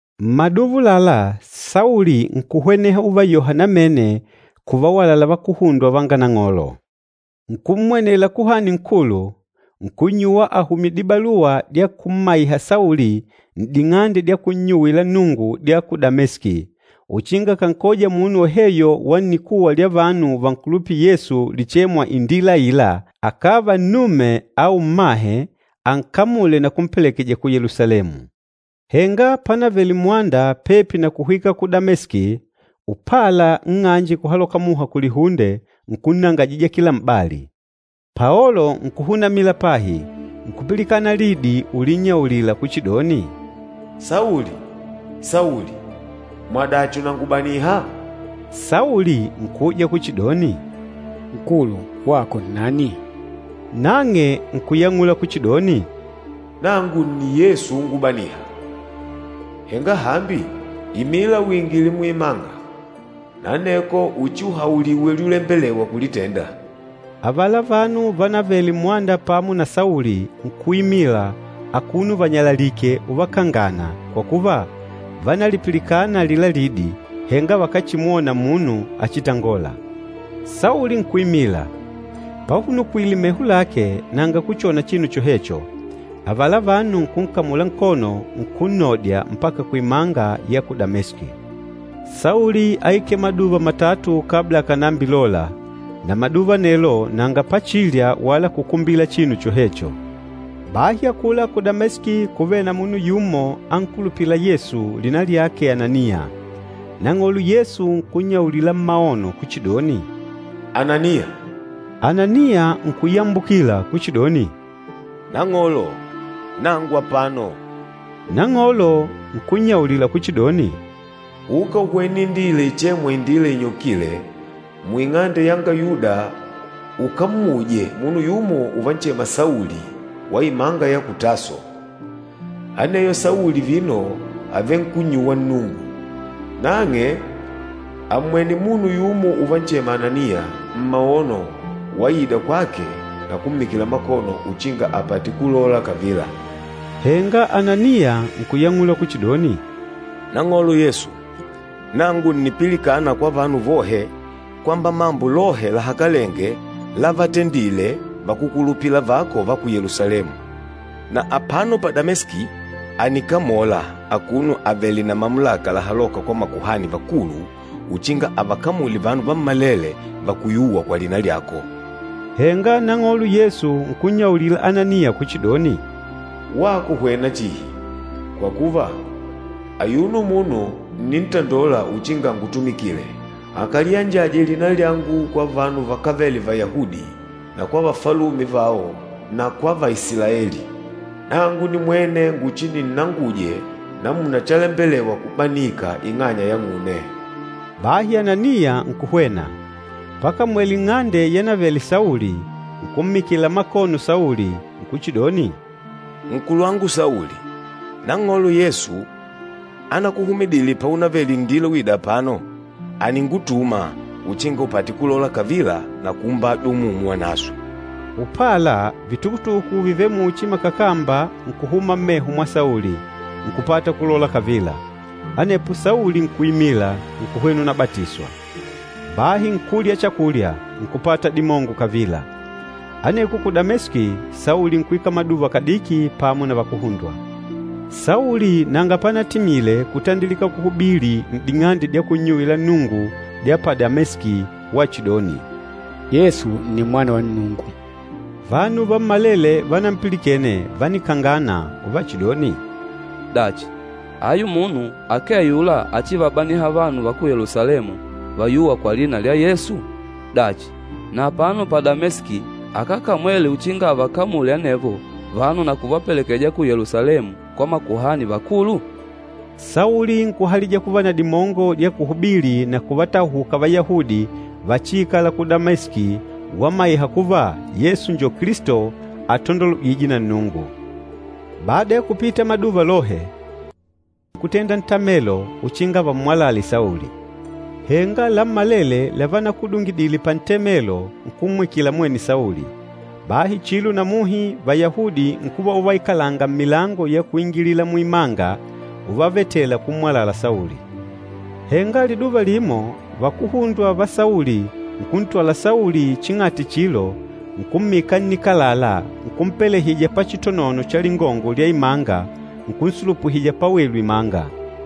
Mmaduva ulala Sauli nkuhweneha uvayoha namene kuvawalala vakuhundwa vanga Nang'olo. Nkummwenela Kuhani Nkulu, nkunnyuwa ahumye dibaluwa dya kummaiha Sauli n'ding'ande dya kunnyuwila Nnungu dya ku Dameski, uchinga akankoja munu woheyo wa nnikuwa lya vanu vankulupîla Yesu lichêmwa, “Indila Aila,” akàva nnume au mmahe ankamule na kumpelekeja ku Yelusalemu. Henga panavele mmwanda pepi na kuhwika ku Dameski, upala nng'anje kuhaloka muha kulihunde nkunnangajija kila m'bali. Paolo nkuhunamila pahi, nkupilikana lidi ulinnyaulila kuchidoni, “Sauli, Sauli! Mwadachi ùnangubaniha?” Sauli nkuuja kuchidoni, “Nkulu, wako nnani?” Nang'e nkuyang'ula kuchidoni, “Nangu nni Yesu úngubanìhà. Henga hambi, imila uingile muimanga, na aneko uchiuhauliwe lyulembelewa kulitenda.” Avala vanu vanavele mmwanda pamo na Sauli nkuimila akuno vanyalalike uvakangana kwa kuva, vánalipilikana alila lidi, henga vakachimwona munu achitangôla. Sauli nkuimila, pahunukwile meho lake nanga kuchona chinu chohecho, avala vanu nkunkamula nkono nkunnodya mpaka kuimanga ya ku Dameski. Sauli áikele maduva matatu kabla akànambilola, na maduva anelo nanga pachilya wala kukumbila chinu chohecho. Bahi akula ku Dameski kúvele na munu yumo ankulupîla Yesu lina lyake Ananiya. Nang'olo Yesu nkunnyaulila mmaono kuchidoni, “Ananiya!” Ananiya nkuyambukila kuchidoni, “Nang'olo, nangu apano.” Nang'olo nkunnyaulila kuchidoni, “Uka uhwene indila ichêmwa, Indila Inyokile, muing'ande yanga Yuda ukammuje munu yumo uvanchema Sauli wa imanga ya ku Taso. Aneyo Sauli vino àvenkunnyuwa Nnungu. Nang'e àmmwene munu yumo uvanchema Ananiya mmaono waida kwake na kummikila makono uchinga apate kulola kavila.” Henga Ananiya nkuyang'ula kuchidoni, “Nang'olo Yesu, nangu ǹnipilikana kwa vanu vohe kwamba mambo lohe lahakalenge lavatendile vakúkulupila vako va ku Yelusalemu. Na apano pa Dameski ànikamola akuno avèlè na mamulaka lahalôka kwa makuhani vakulu uchinga avakamule vanu vammalele vakuyûwa kwa lina lyako.” Henga Nang'olo Yesu nkunnyaulila Ananiya kuchidoni, “Wako hwena chihi, kwa kuva ayuno munu ǹnintandola uchinga angutumikile, akaliyanjaje lina lyangu kwa vanu vakávele Vayahudi na kwa vafalume vao na kwa va Isilaeli. Nangu nimwene nguchininnanguje namuna chalembelewa kubanika ing'anya yang'une.” Bahi Ananiya nkuhwena. Pakamwele n'ng'ande yanavele Sauli, nkummikila makono Sauli, nkuchidoni, “Nkulwangu Sauli, Nang'olo Yesu anakuhumidile paunavele n'ndila uida apano, àningutuma uchinga upate kulole kavila na kuumbajwa Umumu Wanaswe.” Upala vitukutuku vivêle muchi makakamba nkuhuma mmeho mwa Sauli, nkupata kulola kavila. Anepo Sauli nkuimila, nkuhwena unabatiswa. Bahi nkulya chakulya, nkupata dimongo kavila. Aneko ku Dameski, Sauli nkuikala maduva kadiki pamo na vakuhundwa. Sauli nanga panatimile kutandilika kuhubili n'ding'ande dya kunnyuwila Nnungu dya pa Dameski wachidoni, “Yesu nni Mwana wa Nnungu.” Vanu vammalele vanampilikene vánikangana uvachidoni, “Dachi, ayu munu akee ayula achivabaniha vanu va ku Yelusalemu vayûwa kwa lina lya Yesu? Dachi, na apano pa Dameski akákamwele uchinga avakamule anevo vanu na kuvapelekeja ku Yelusalemu kwa makuhani vakulu?” Sauli nkuhalija kuva na dimongo dya kuhubili na kuvatahuka Vayahudi vachiikala ku Dameski wamaiha kuva Yesu njo Kilisto atandolwejîje na Nnungu. Bada ya kupita maduva lohe, Vayahudi nkutenda ntamelo uchinga vammwalale Sauli. Henga lammalele lavanakudungidile pantemelo nkummwikila mwene Sauli. Bahi chilo na muhi Vayahudi nkuva uvaikalanga mmilango ya kuingilila muimanga uvavetela kummwalala Sauli. Henga liduva limo vakuhundwa va Sauli nkuntwala Sauli ching'ati chilo nkummika nnikalala nkumpelehija pachitonono cha lingongo lya imanga, nkunsulupuhija pawelu imanga.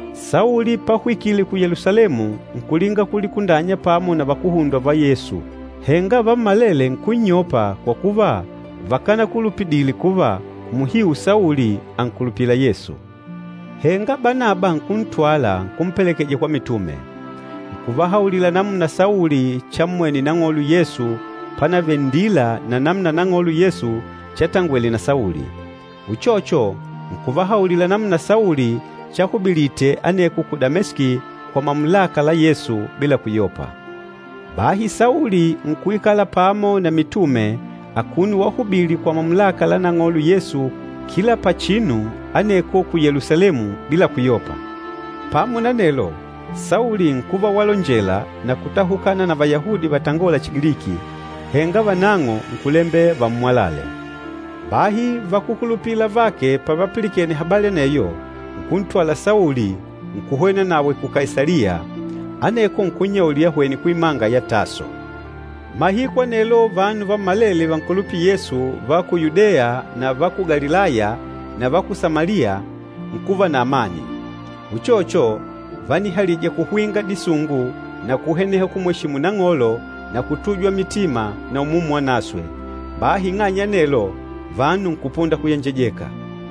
Sauli pahwikile ku Yelusalemu nkulinga kulikundanya pamo na vakuhundwa va Yesu. Henga vammalele nkunnyopa kwa kuva vakanakulupidile kuva muhiu Sauli ànkulupila Yesu. Henga Banaba nkuntwala nkumpelekeja kwa mitume. Nkuvahaulila namuna Sauli chammwene Nang'olo Yesu panavele nndila na namuna Nang'olo Yesu chatangwele na Sauli. Uchocho, nkuvahaulila namuna Sauli chahubilite aneko ku Dameski kwa mamulaka la Yesu bila kuyopa. Bahi Sauli nkuikala pamo na mitume akuno wahubili kwa mamulaka la Nang'olo Yesu kila pachinu aneko ku Yelusalemu bila kuyopa. Pamo na anelo, Sauli nkuva walonjela na kutahukana na Vayahudi vatangôla Chigiliki, henga vanang'o nkulembela vammwalale. Bahi vakúkulupila avake pavapilikene habali aneyo, nkuntwala Sauli, nkuhwenawe ku Kaisaliya, aneko nkunnyaulila ahwene kuimanga ya Taso. Mahiku anelo vanu vammalele vankulupîla Yesu va ku Yudeya na va ku Galilaya na va ku Samaliya nkuva na amani. Uchocho, vánihalija kuhwinga disungu na kuhweneha kumweshimu Nang'olo na kutujwa mitima na Umumu Wanaswe, bahi ing'anya ya anelo vanu nkupunda kuyenjejeka.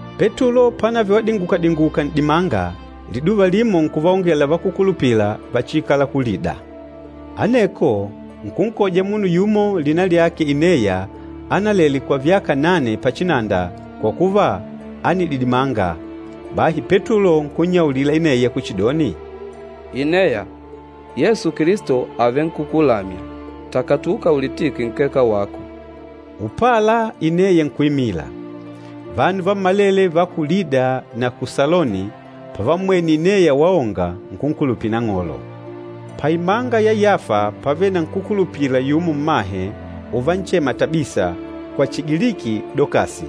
Petulo pánavele wadingukadinguka n'dimanga, liduva limo nkuvaongela vakúkulupila vachiikala ku Lida. Aneko nkunkoja munu yumo lina lyake Ineya analele kwa vyaka nane pachinanda kwa kuva ánididimanga. Bahi Petulo nkunnyaulila Ineya kuchidoni, “Ineya, Yesu Kilisto avenkukulamya. Takatuka ulitike nkeka wako.” Upala Ineya nkuimila. Vanu vammalele va ku Lida na ku Saloni pavammwene Ineya waonga, nkunkulupila Nang'olo. Paimanga ya Yafa pávele na nkúkulupila yumo mmahe avanchema Tabisa, kwa Chigiliki Dokasi.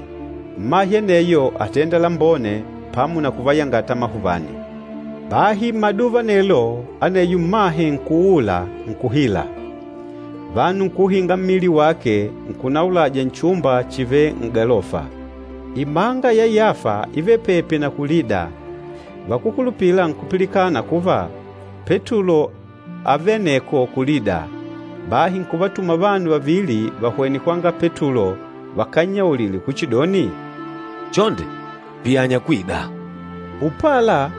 Mmahe aneyo átenda lambone pamo na kuvayangata amahuvani. Bahi mmaduva anelo, aneyo mmahe nkuuula, nkuhila. Vanu nkuuhinga mmili wake, nkunaulaja nchumba chivêle n'galofa. Imanga ya Yafa ívele pepi na ku Lida. Vakúkulupila nkupilikana kuva Petulo ávele aneko ku Lida, bahi nkuvatuma vanu vavili vahwene kwanga Petulo vakannyaulile kuchidoni, “Chonde, piyanya kwida.” Upala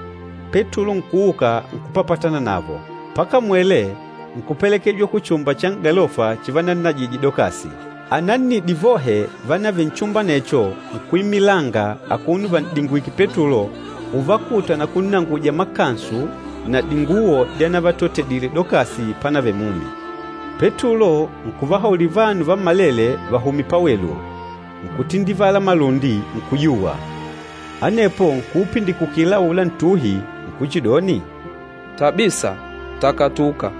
Petulo nkuuka nkupapatana navo. Pakamwele, nkupelekejwa kuchumba cha n'galofa chivannajije Dokasi. Anannidi vohe vanavele nchumba anecho nkuimilanga akuno van'dingwike Petulo uvakuta na kunnanguja makansu na dinguwo dyanavatotedile Dokasi panavele mumi. Petulo nkuvahaulila vanu vammalele vahume pawelu, nkutindivala malundi, nkuyuwa. Anepo nkuupindikukila aula ntuhi, nkuchidoni, “Tabisa, takatuka.”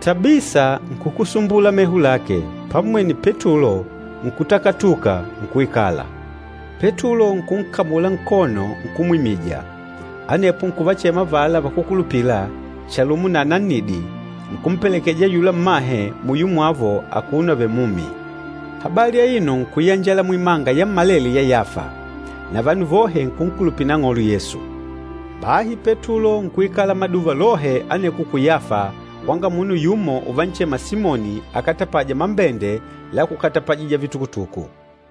Tabisa nkukusumbula meho lake, pammwene Petulo, nkutakatuka, nkuikala. Petulo nkunkamula nkono nkumwimija, anepo nkuvachema avala vakúkulupila chalumo na anannidi, nkumpelekeja ayula mmahe muyo mwavo akuno avèlè mumi. Habali aino nkuyanjala muimanga yammalele ya Yafa, na vanu vohe nkunkulupila Nang'olo Yesu. Bahi Petulo nkuikala maduva lohe aneko ku Yafa kwanga munu yumo uvanchema Simoni akatapâja mambende la kukatapajija vitukutuku.